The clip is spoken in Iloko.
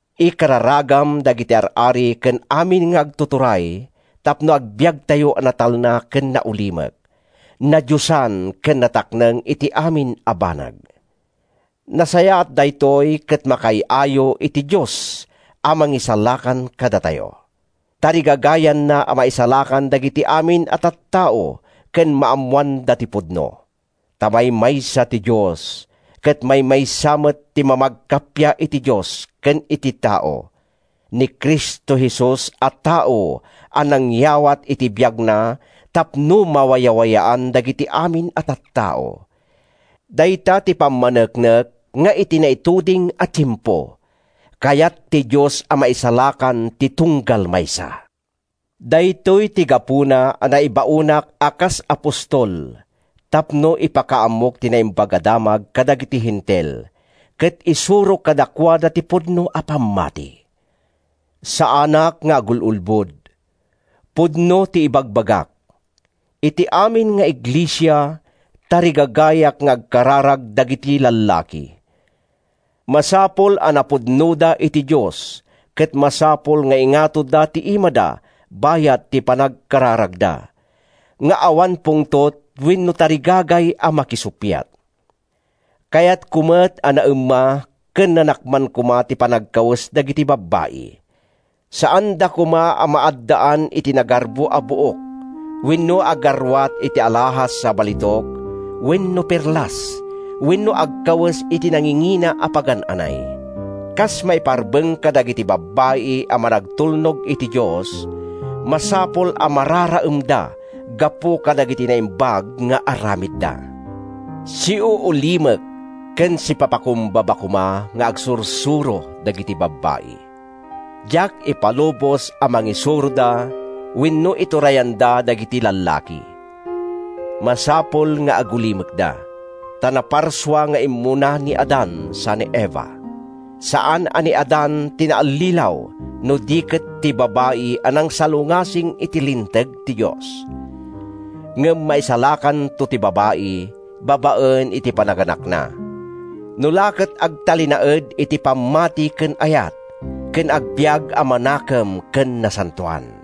Ikararagam dagiti ar-ari ken amin nga agtuturay tapno agbiagtayo a natalna ken naulimek, nadiosan ken natakneng iti amin a banag. Nasayaat daytoy ket makaay-ayo iti Dios a Mangisalakan kadatayo. Tarigagayanna a maisalakan dagiti amin a tattao ken maammoanda ti pudno. Ta maymaysa ti Dios, ket maymaysa met ti mamagkappia iti Dios ken iti tao, ni Cristo Jesus a tao a nangyawat iti biagna tapno mawayawayaan dagiti amin a tattao. Dayta ti pammaneknek nga, iti naituding a tiempo, kayat ti Dios a maisalakan ti tunggal maysa. Daytoy ti gapuna a naibaonak a kas apostol, tapno ipakaammok ti Naimbag a Damag kadagiti Hentil, ket isurok kadakuada ti pudno a pammati. Saanak nga agul-ulbod. Pudno ti ibagbagak. Iti amin nga iglesia, tarigagayak nga agkararag dagiti lallaki. Masapul a napudnoda iti Dios ket masapul nga ingatoda ti imada bayat ti panagkararagda, nga awan pungtot wenno tarigagay a makisuppiat. Kayatko met a naemma ken nanakman koma ti panagkawes dagiti babbai. Saanda koma a maaddaan iti nagarbo a buok wenno agarruat iti alahas a balitok wenno perlas wenno agkawes iti nangingina a pagan-anay. Kas maiparbeng kadagiti babbai a managtulnog iti Dios, masapul a mararaemda gapu kadagiti naimbag nga aramidda. Siuulimek ken sipapakumbaba koma nga agsursuro dagiti babbai. Diak ipalubos a mangisuroda wenno iturayanda dagiti lallaki. Masapul nga agulimekda. Ta naparsua nga immuna ni Adan sa ni Eva. Saan a ni Adan ti naallilaw no di ket ti babai a nangsalungasing iti linteg ti Dios. Ngem maisalakanto ti babai babaen iti panaganakna, no la ket agtalinaed iti pammati ken ayat ken agbiag a manakem ken nasantoan.